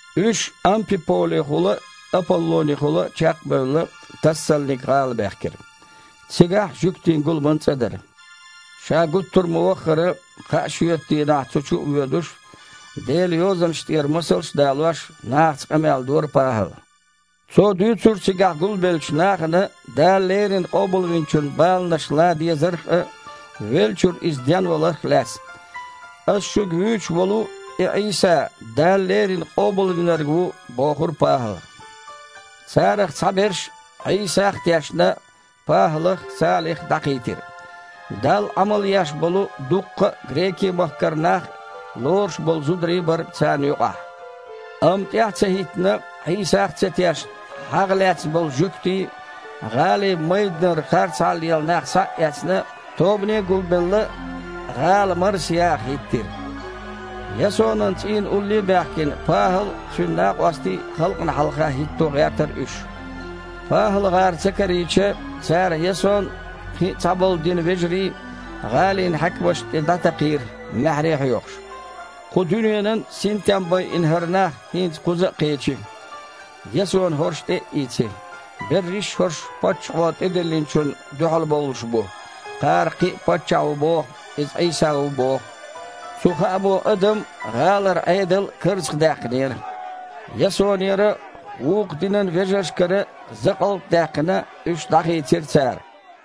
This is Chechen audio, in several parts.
Уьш, Ампиполехула а, Аполлонехула а чекх а бевлла, Тассалник-гІала баьхкира. Цигахь жуьгтийн гуламан цІа дара. Ша гуттар а ма-ваххара, кхаа шоьтан дийнахь цу чу а воьдуш, Делан Йозанаш тІера масалш а далош, нахаца къамел дора ПахІала. Цо дуьйцура цигахь гулбеллачу нахана Дала леррина Къобалвинчун баланаш лан дезарх а, веллачуьра Иза денваларх а лаьцна. Ас шуьга вуьйцуш волу и Іийса Дала леррина Къобалвинарг ву бохура ПахІала. Царах цхьаберш, Іийсах а тешна, ПахІалах а, Салих а дІакхийтира. Далла Іамал еш болу дуккха а Грекийн-махкара нах а, лоруш болу зударий а бара царна юкъахь. Амма тІаьхьа ца хІиттина, Іийсах а ца тешна, хьагІ лаьцна болу жуьгтий, гІалин майданара харцахьа лела нах схьа а эцна, тобане а гулбелла, гІала марсаяха хІиттира. Ясонан цІийна улло а баьхкина, ПахІал а, цуьнан накъостий а халкъана хьалха хІитто гІертара уьш. ПахІалгІар ца карийча, цара Ясон а, кхин а цхьаболу динан вежарий гІалин хьаькамашна тІе дІатакхийра, маьхьарий а хьоькхуш: «Кху дуьненан а синтем байина хІара нах хІинца кхуза а кхечи, Ясона хІорш тІе а ийци! Берриш хІорш паччахьо тІедиллинчунна дуьхьал бовлуш бу, кхара кхин паччахь ву боху, иза Іийса ву а боху». Цу хаамо адам а, гІалара Іедал а карзахе даьккхинера. Ясонера а, вукху динан вежаршкара а закъалт а даьккхина, уьш дІахийцира цара.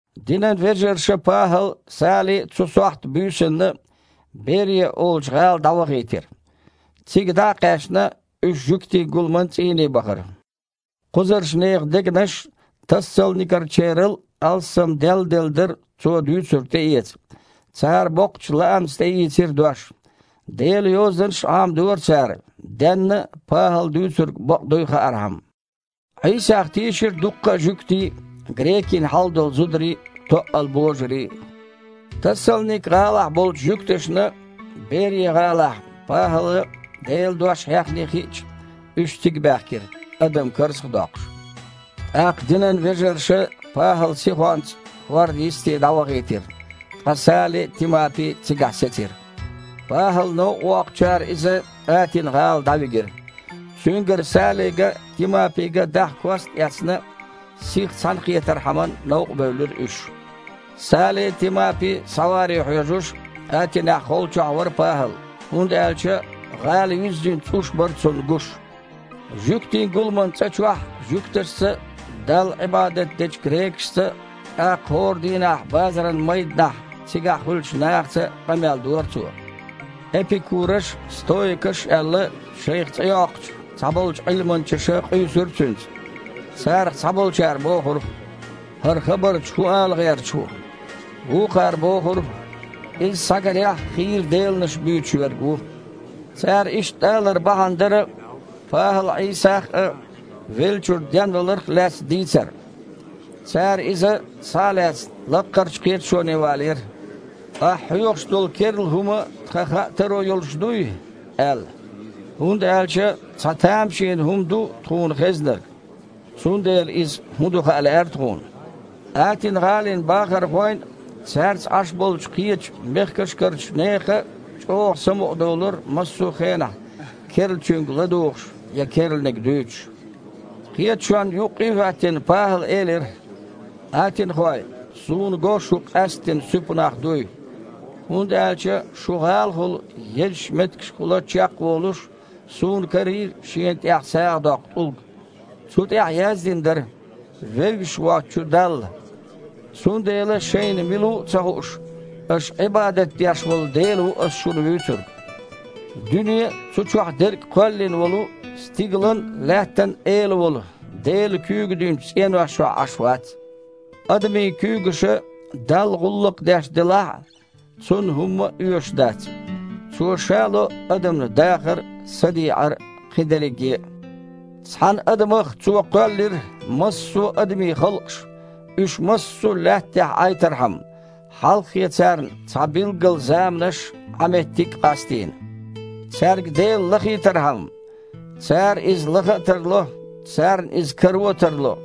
Динан вежарша ПахІал а, Сали а цу сохьта буьйсанна Берия олучу гІала дІавахийтира. Цига дІа а кхаьчна, уьш жуьгтийн гуламан цІийне бахара. Кхузарчу нехан дегнаш Тассалникерачарел алссам делладелла дара цо дуьйцург тІеэца. Цара боккхачу лаамца тІеийцира дош. Делан Йозанаш а Іамадора цара, денна а ПахІала дуьйцург бакъ дуй хаархьама. Іийсах тийшира дуккха а жуьгтий а, грекийн хьалдолу зударий а, тоъал божарий а. Тассалник-гІалахь болчу жуьгташна Берия-гІалахь ПахІала Делан дош хьехний хиъча, уьш цига баьхкира, адам карзах а доккхуш. ТІаккха динан вежарша ПахІал сихонца хІордан йисте дІавахийтира, ткъа Сали а, Тимапи а цигахь сецира. ПахІал новкъа воккхучара иза Атина-гІала дІавигира. Цуьнгара Салига а, Тимапига а дахьа кост а эцна, сиха цхьаьнакхетархьама новкъабевлира уьш. Сали а, Тимапи а схьаваре хьоьжуш, Атинехь холчохь вара ПахІал, хІунда аьлча гІала юьззина цІуш бара цунна гуш. Жуьгтийн гуламан цІа чохь жуьгташца а, Далла Іибадат дечу грекашца а, тІаккха хІора дийнахь базаран майданахь цигахь хуьлучу нахаца а къамел дора цо. Эпикураш а, стоикаш а аьлла, шайх цІе йоккхучу цхьаболчу Іилманчаша къуьйсура цуьнца. Царах цхьаболчара бохура: «ХІара хабарча хІун ала гІерташ ву?», вукхара бохура: «Иза, схьагарехь, хийра деланаш буьйцуш верг ву». Цара иштта алар бахьана дара ПахІала Іийсах а, веллачуьра денваларх а лаьцна дийцар. Цара иза, схьа а лаьцна, лаккхарчу кхеташоне валийра: «Ахь хьоьхуш долу керла хІума тхан хаа таро йолуш дуй?» – аьлла. «ХІунда аьлча цхьа тамашийна хІума ду тхуна хезнарг, цундела иза хІун ду хаа лаьара тхуна?» (Атина-гІалин бахархойн а, цаьрца Іаш болчу кхечу мехкашкарчу нехан а чІогІа самукъадолура массо а хенахь керлачуьнга ладугІуш я керланиг дуьйцуш.) Кхеташонна юккъе а хІоьттина, ПахІала элира: «Атинахой, суна го шу къаьсттина суьпа нах дуй, хІунда аьлча шун гІалахула езачу меттигашкахула чекхволуш, суна карийра шена тІехь сагІа доккху тІулг. Цу тІехь яздина дара: „Вевзаш воцучу Далла“. Цундела шайна мила ву а ца хууш, аша Іибадат деш волу Дела ву ас шуна вуьйцург. Дуьне а, цу чохь дерг а кхоьллина волу, стигалан а, лаьттан а Эла волу Дела куьйга динчу цІенош чохь Іаш вац. Адамийн куьйгаша Далла гІуллакх деш делахь а, Цунна хІума а оьшуш дац. Цо Ша ло адамна дахар а, садеІар а, кхин дерриге а. Цхьана адамах Цо кхоьллира массо а адамийн халкъаш, уьш массо а Лаьтта тІехь Іайтархьама, хьалххе царна цхьа билггала заманаш а, Іан меттиг а къастийна, цаьрга Дела лахийтархьама: цара Иза лаха а тарло, царна Иза каро а тарло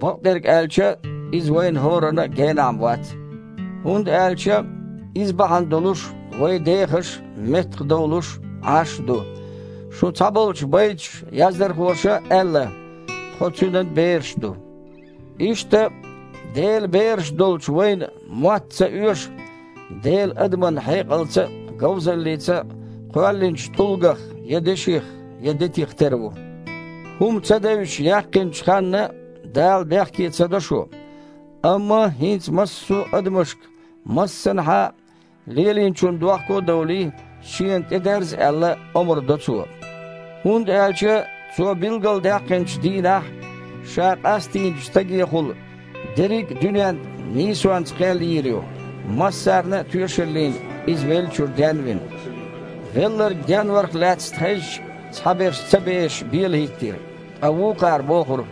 (бакъдерг аьлча, Иза вайна хІоранна а генахь-м вац). ХІунда аьлча „Иза бахьана долуш вай дехаш а, меттахдовлуш а, Іаш а ду“. Шун цхьаболчу байташ язъярхоша аьлла: „Тхо Цуьнан бераш ду“. Иштта, Делан бераш долчу вайна мотта ца оьшу Дела адаман хьекъалца а, говзаллица а кхоьллинчу тІулгах, я деших, я детих тера ву. ХІума ца девзаш яьккхинчу ханна Дала бехке ца до шу, амма хІинца массо а адамашка, массанхьа а, лелийначунна дохко а довлий, Шена тІедерза аьлла, омра до Цо. ХІунда аьлча Цо билгалдаьккхинчу дийнахь Ша къастийначу Стагехула дерриг а дуьненна нийсонца кхел йийр ю, массарна а тоьшаллина Иза веллачуьра ден а вина». Велларг денварх лаьцна хезча, цхьаберш ца бешаш бела хІиттира, ткъа вукхара бохура: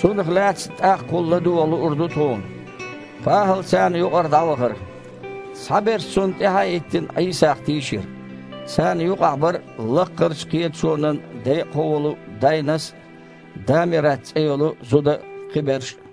«Цунах лаьцна тІаккхахула ладогІа луур ду тхуна». ПахІал царна юкъара дІавахара. Цхьаберш, цунна тІаьхьа а хІиттина, Іийсах тийшира. Царна юкъахь бара лаккхарчу кхеташонан декъахо волу Дайнас а, Дамират цІе йолу зуда а, кхиберш а.